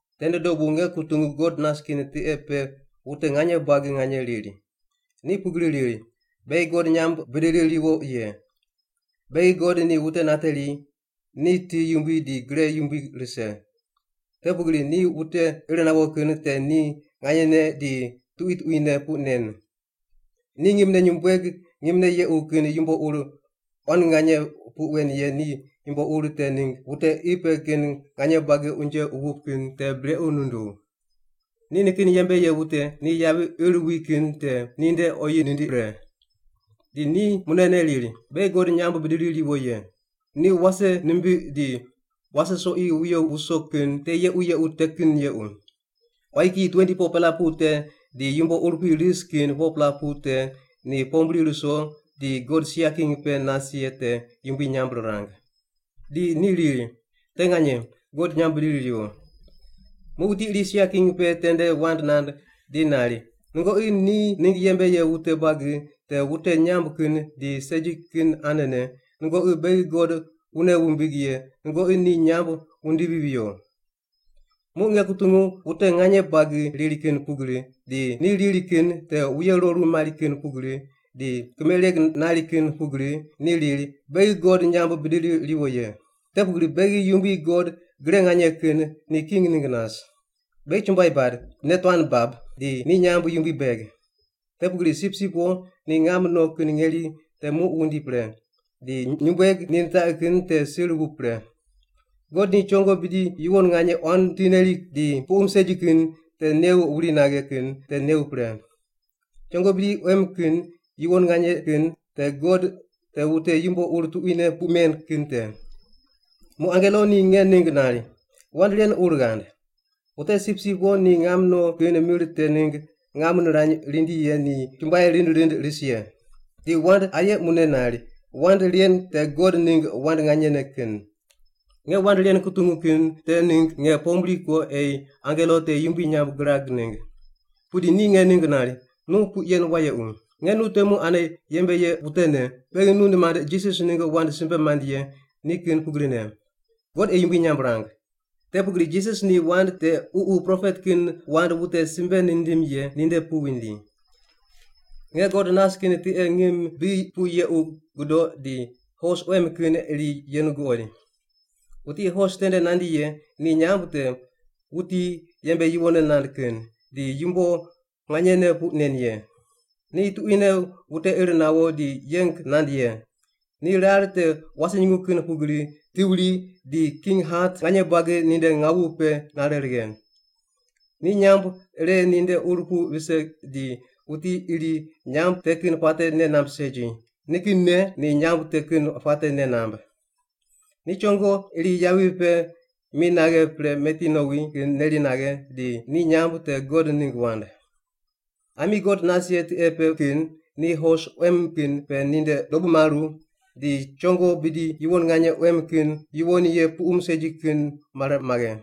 Tende dobu nge kutungu God nas kin tiqe pe wute nganye buagi nganye riri. Ni pugri riri, “Beghi God nyamb bidiri ruwo ye. Beghi God ni wute nateri, ni ti yumbui di gre yumbui rise. Te pugri ni wute ir nawo kin te ni nganyene di tuqui tuquine puq nen. Ni ngimne nyumbueg ngimne yequ kin yumbo ur quan nganye puq wen ye ni yumbo ur te ningg wute qi pe kin nganye buagi unje wup kin te brequ nunduw. Ni nikin yembe ye wute ni yavi ir wi kin te ninde oyi nindiq pre.” Di ni munene riri, “Beghi God nyamb bidiri riwo ye. Ni wase nimbiq di wase soqi wuyo wuso kin te yequ yequ te kin yequ.” Quayi kiyi 24-pela pu te di yumbo urupui ris kin 4-pela pu te ni pombri ruso di God sia king pe nas ye te yumbui nyamb rirang. Di ni riri, “Te nganye, God nyamb bidiri riwo!” Muq wuti iri sia king pe tende wand nand di nari, “Nungoqi ni ningg yembe ye wute buagi te wute nyamb kin di segi kin anene, nungoqi beghi God wune wumbig ye nungoqi ni nyamb wundivi viyo!” Muq nge kutungu wute nganye buagi riri kin pugri, di ni riri kin te wuye roru mari kin pugri, di kimereg nari kin pugri, ni riri, “Beghi God nyamb bidiri riwo ye. Te pugri beghi Yumbui God Gre Nganye Kin ni king ningg nas. Beghi chumbuai bad, nei tuan bab, di ni nyamb yumbui beg. Te pugri Sipsip Wo ni ngam no kin ngeri te muq wundi pre, di nyumbueg ni nitaqi kin te sir wup pre. God ni chongo bidi yuwon nganye quan ti neri di puqum segi kin te new wuri naghe kin te new pre.” Chongo bidi quem kin yuwon nganye kin te God te wute yumbo ur tuquine puq men kin te. Muq angelo ni nge ningg nari, “Wand ren ur ghand, ‘Wute Sipsip Wo ni ngam no kin mir te ningg ngam nirany rindi ye ni chumbuai rind rind ris ye’.” Di wand aye mune nari, “Wand ren te God ningg wand nganyene kin.” Nge wand ren kutungu kin te ningg nge pombri ko ei angelo te yumbui nyamb girag ningg. Pudi ni nge ningg nari, “Nu puq yen wayequ! Nge nu temu ane yembe ye wutene, beghi nu nimand Jisas ningg wand simbe mand ye ni kin pugrine. God ei yumbui nyamb rang! Te pugri Jisas ni wand te Ququ propet kin wand wute simbe nindim ye ninde pu vindi.” Nge God nas kin tiqe ngim bi pu yequ gudoq di hos quem kin iri yenu guqoid. Wuti hos tende nandi ye ni nyamb te, “Wuti yembe yuwonne nand kin,” di “Yumbo nganyene puq nen ye.” Ni tuquine wute ir nawo di yeng nand ye. Ni rar te wase nyungu kin pugri ti wuri di king hat nganye buagi ninde ngawu pe nare righe. Ni nyamb ire ninde ur pu vise di wuti iri nyamb te kin puate nei namb segi, nikinne ni nyamb te kin puate nei namb. Ni chongo iri yavi pe mi naghe pre meti nowi kin neri naghe di ni nyamb te God Ningg Wand. Ami God nas ye tiqe pe kin ni hos quem kin pe ninde dobu maru di chongo bidi yuwon nganye quem kin yuwon ye puqum segi kin mare maghe.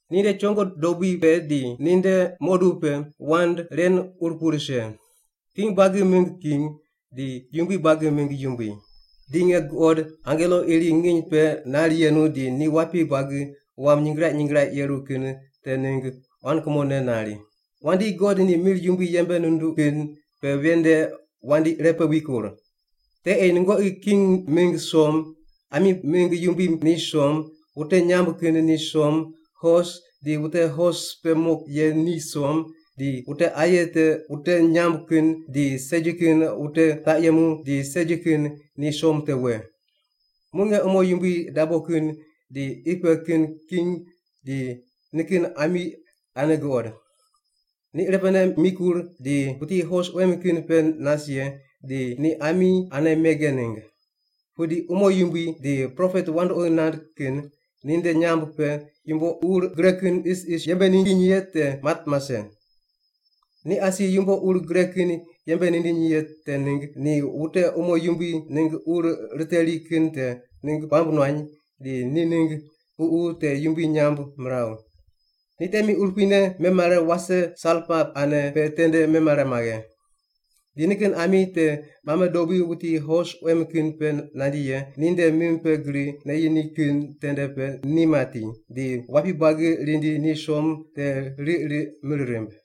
Ninde chongo dobui pe di ninde muqodub pe wand ren ur pu rise, “King buagi mingg king, di yumbui buagi mingg yumbui.” Di nge guqod angelo iri nginy pe nar yenu di ni wapi buagi wam nyingraiq nyingraiq yeru kin te ningg quan kumone nari, “Wandi, God ni mir yumbui yembe nunduq kin pe ven nde wandi irepe wikur. Te ei nungoqi king mingg som, ami mingg yumbui ni som, wute nyamb kin ni som, hos di wute hos pe mo ye ni som, di wute aye te wute nyamb kin di segi kin wute taq yemu di segi kin ni som te we.” Muq nge umo yumbui dabo kin di qi pe kin king di nikin ami ane guqod. Ni irepene mikur di wuti hos quem kin pe nas ye di ni ami ane mege ningg. Pudi umo yumbui di propet wandoqi nand kin ninde nyamb pe yumbo ur gre kin isis yembe nindiny ye te mat mase. Ni asi yumbo ur gre kin yembe nindiny ye te ningg ni wute umo yumbui ningg ur riteri kin te ningg puamb nuany di ni ningg ququ te yumbui nyamb miraw. Ni temi urupuine memare wase salpa ane pe tende memare maghe. Di nikin ami te mame dobui wuti hos quem kin pe nandi ye ninde mim pe gri neyi ni kin tende pe ni mati, di wapi buagi rindi ni som te riq riq mir rimb.